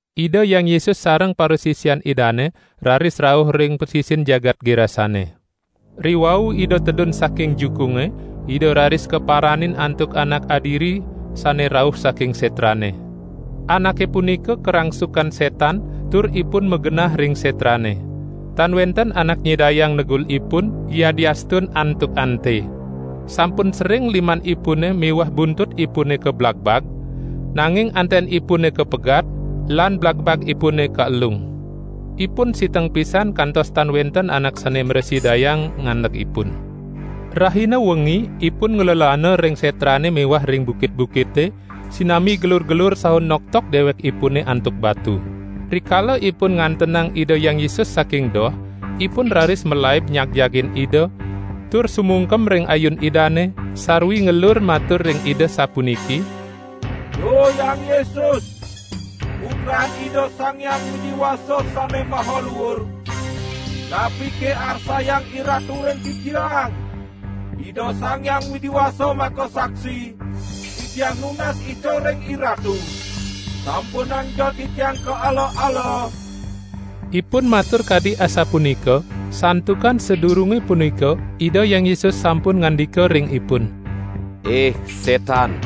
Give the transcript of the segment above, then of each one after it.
Ida Hyang Yesus sareng parasisian Idane raris rauh ring pasisin jagat Gerasane. Riwau Ida tedun saking jukunge Ida raris kaparanin antuk anak adiri sane rauh saking setrane. Anake punika karangsukan setan tur ipun magenah ring setrane. Tan wenten anak nyidayang negul ipun, yadiastun antuk ante; sampun sering limanipune miwah buntutipune kablagbag, nanging antenipun kapegat, lan blagbagipune kaelung. Ipun siteng pisan kantos tan wenten anak sane mrasidayang ngandeg ipun. Rahina wengi ipun nglelana ring setrane miwah ring bukit-bukite, sinambi gelur-gelur saha noktok dewekipune antuk batu. Rikala ipun ngantenang Ida Hyang Yesus saking doh, ipun raris malaib nyagjagin Ida, tur sumungkem ring ayun Idane, sarwi ngelur matur ring Ida sapuniki: "Duh Hyang Yesus, Putran Ida Sang Hyang Widi Wasa Sane Maha Luur! Napike arsayang IRatu ring titiang? Ida Sang Hyang Widi Wasa makasaksi, titiang nunas ica ring IRatu, sampunangja titiang kaala-ala!" ( Ipun matur kadi asapunika, santukan sadurunge punika Ida Hyang Yesus sampun ngandika ring ipun: "Ih setan,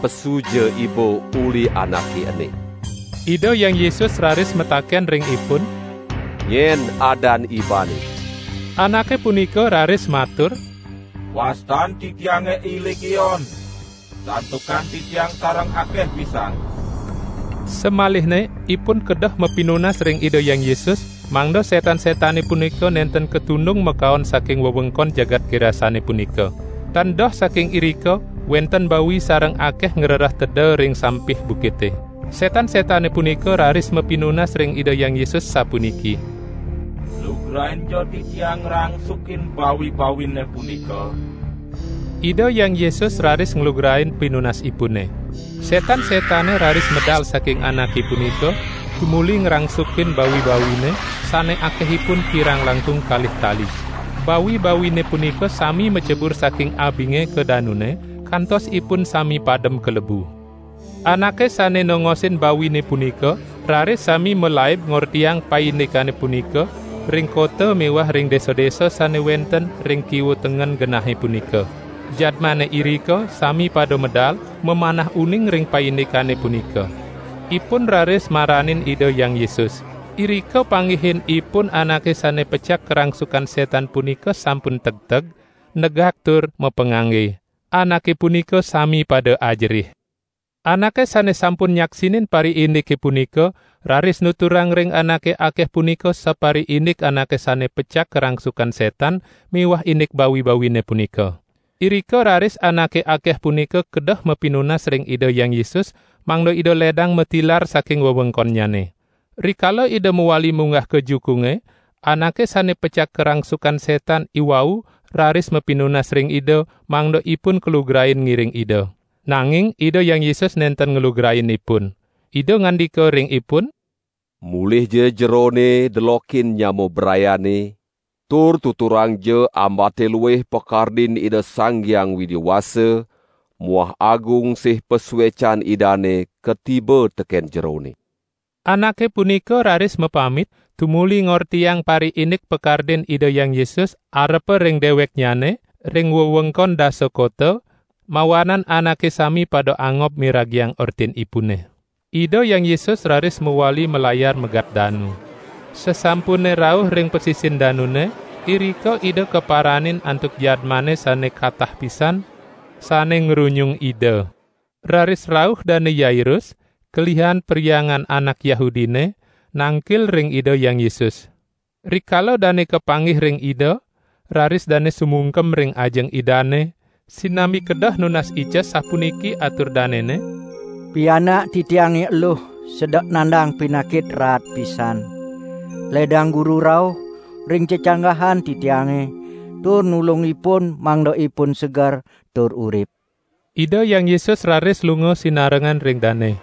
pesuja iba uli anake ene!") Ida Hyang Yesus raris mataken ring ipun: "Nyen adan ibane?" Anake punika raris matur: "Wastan titiange I Legion, santukan titiang sareng akeh pisan." Samalihne ipun kedeh mapinunas ring Ida Hyang Yesus, mangda setan-setane punika nenten katundung makaon saking wewengkon jagat Gerasane punika. Tan doh saking irika wenten bawi sareng akeh ngrereh teda ring sampih bukite. Setan-setane punika raris mapinunas ring Ida Hyang Yesus sapuniki: "Lugrainja titiang ngrangsukin bawi-bawine punika!" Ida Hyang Yesus raris nglugrain pinunasipune. Setan-setane raris medal saking anake punika, tumuli ngrangsukin bawi-bawine, sane akehipun kirang langkung kalih tali. Bawi-bawine punika sami macebur saking abinge ka danune, kantos ipun sami padem kalebu. Anake sane nongosin bawine punika raris sami malaib ngortiang paindikane punika ring kota miwah ring desa-desa sane wenten ring kiwa tengen genahe punika. Jadmane irika sami pada medal, mamanah uning ring paindikane punika. Ipun raris maranin Ida Hyang Yesus. Irika panggihin ipun anake sane pecak karangsukan setan punika sampun tegteg, negak tur mapangangge. Anake punika sami pada ajerih. Anake sane sampun nyaksinin pariindike punika, raris nuturang ring anake akeh punika sapariindik anake sane pecak karangsukan setan miwah indik bawi-bawine punika. Irika raris anake akeh punika kedeh mapinunas ring Ida Hyang Yesus, mangda Ida ledang matilar saking wewengkonnyane. Rikala Ida mawali munggah ka jukunge, anake sane pecak karangsukan setan iwau raris mapinunas ring Ida, mangda ipun kalugrain ngiring Ida. Nanging Ida Hyang Yesus nenten nglugrain ipun. Ida ngandika ring ipun: "Mulihja jerone delokin nyama brayane, tur tuturangja ambate luih pakardin Ida Sang Hyang Widi Wasa muah agung sih pasuecan Idane katiba teken jerone." Anake punika raris mapamit, tumuli ngortiang pariindik pakardin Ida Hyang Yesus arepa ring deweknyane, ring wewengkon Dasa Kota, mawanan anake sami pada angob miragiang ortinipune. Ida Hyang Yesus raris mawali malayar megat danu. Sasampune rauh ring pasisin danune, irika Ida kaparanin antuk jadmane sane katah pisan, sane ngrunyung Ida. Raris rauh Dane Yairus, kelihan perhyangan anak Yahudine, nangkil ring Ida Hyang Yesus. Rikala dane kapanggih ring Ida, raris dane sumungkem ring ajeng Idane, sinambi kedeh nunas ica sapuniki atur danene: "Pianak titiange eluh sedek nandang pinakit raat pisan. Ledang Guru rauh ring cecanggahan titiange tur nulung ipun mangda ipun seger tur urip." Ida Hyang Yesus raris lunga sinarengan ring dane.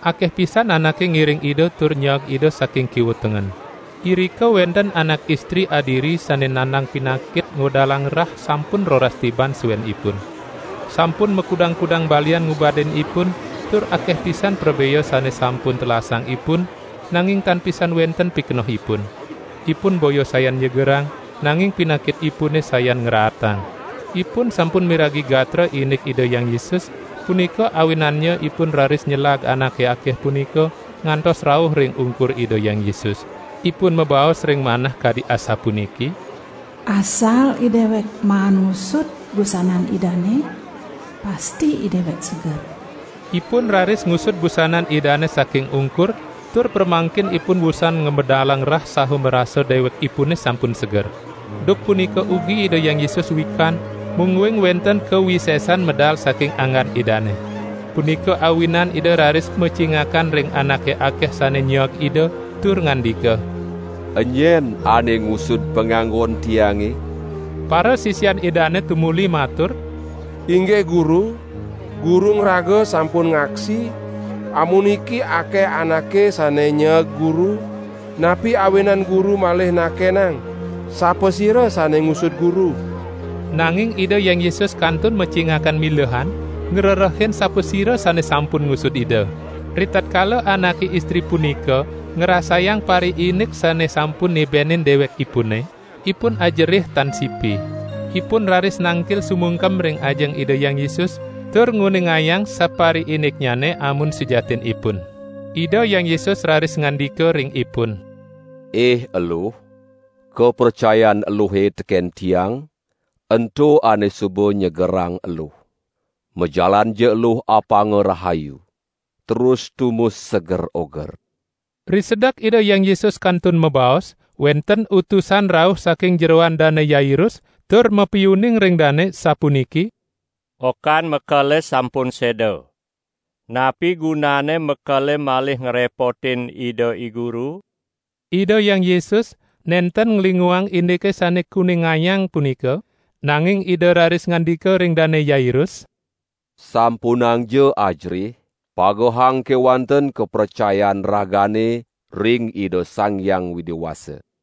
Akeh pisan anake ngiring Ida tur nyeeg Ida saking kiwa tengen. Irika wenten anak istri adiri sane nandang pinakit ngwedalang rah sampun roras tiban suenipun; sampun makudang-kudang balian ngubadin ipun, tur akeh pisan prabea sane sampun telasang ipun, nanging tan pisan wenten pikenohipun. Ipun boya sayan nyegerang, nanging pinakitipune sayan ngraatang. Ipun sampun miragi gatra indik Ida Hyang Yesus, punika awinannya ipun raris nyelag anake akeh punika, ngantos rauh ring ungkur Ida Hyang Yesus. Ipun mabaos ring manah kadi asapuniki: "Asal idewek maan ngusud busanan Idane, pasti idewek seger." Ipun raris ngusud busanan Idane saking ungkur, tur pramangkin ipun wusan ngamedalang rah saha marasa dewekipune sampun seger. Duk punika ugi Ida Hyang Yesus wikan, mungguing wenten kawisesaan medal saking anggan Idane. Punika awinan Ida raris macingakan ring anake akeh sane nyeeg Ida, tur ngandika: "Enyen ane ngusud panganggon Tiange?" Parasisian Idane tumuli matur: "Inggih Guru, Guru ngraga sampun ngaksi, amuniki akeh anake sane nyeeg Guru; napi awinan Guru malih nakenang sapasira sane ngusud Guru?" Nanging Ida Hyang Yesus kantun macingakan milehan, ngrerehin sapasira sane sampun ngusud Ida. Ritatkala anake istri punika ngrasayang pariindik sane sampun nibenin dewekipune, ipun ajerih tan sipi. Ipun raris nangkil sumungkem ring ajeng Ida Hyang Yesus, tur nguningayang sapariindiknyane amun sujatinipun. Ida Hyang Yesus raris ngandika ring ipun: "Ih eluh, kapracayan eluhe teken Tiang, ento ane suba nyegerang eluh. Majalanja eluh apanga rahayu, terus tumus seger oger." Risedek Ida Hyang Yesus kantun mabaos, wenten utusan rauh saking jeroan Dane Yairus, tur mapiuning ring dane, sapuniki: "Okan mekele sampun seda. Napi gunanne mekele malih ngrepotin Ida I Guru?" Ida Hyang Yesus nenten nglinguang indike sane kuningayang punika, nanging Ida raris ngandika ring Dane Yairus: "Sampunangja ajerih, pagehang kewanten kapracayan ragane ring Ida Sang Hyang Widi Wasa!"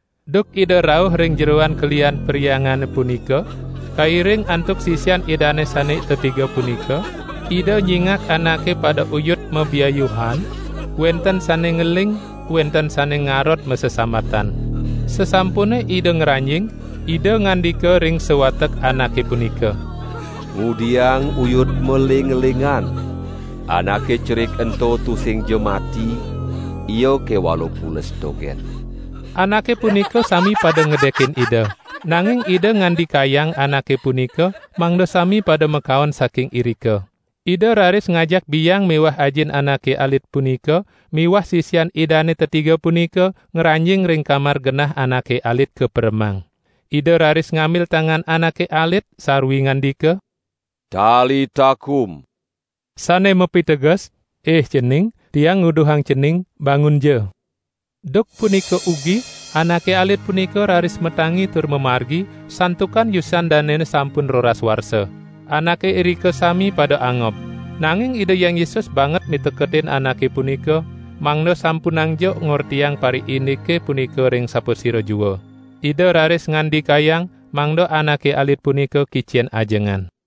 Duk Ida rauh ring jeroan kelihan perhyangane punika kairing antuk sisian Idane sane tetiga punika, Ida nyingak anake pada uyut mabiayuhan, wenten sane ngeling, wenten sane ngarod masesambatan. Sasampune Ida ngranjing, Ida ngandika ring sawatek anake punika: "Ngudiang uyut maeling-elingan? Anake cerik ento tusingja mati, ia kewala pules dogen!" Anake punika sami pada ngedekin Ida. Nanging Ida ngandikayang anake punika mangda sami pada makaon saking irika. Ida raris ngajak biang miwah ajin anake alit punika miwah sisian Idane tetiga punika ngranjing ring kamar genah anake alit kaperemang. Ida raris ngambil tangan anake alit, sarwi ngandika: "Talita kum!" sane mapiteges: "Ih cening, Tiang nguduhang cening, bangunja!" Duk punika ugi, anake alit punika raris matangi tur mamargi, santukan yusan danene sampun roras warsa. Anake irika sami pada angob. Nanging Ida Hyang Yesus banget miteketin anake punika, mangda sampunangja ngortiang pariindike punika ring sapasira jua. Ida raris ngandikayang, mangda anake alit punika kicen ajengan.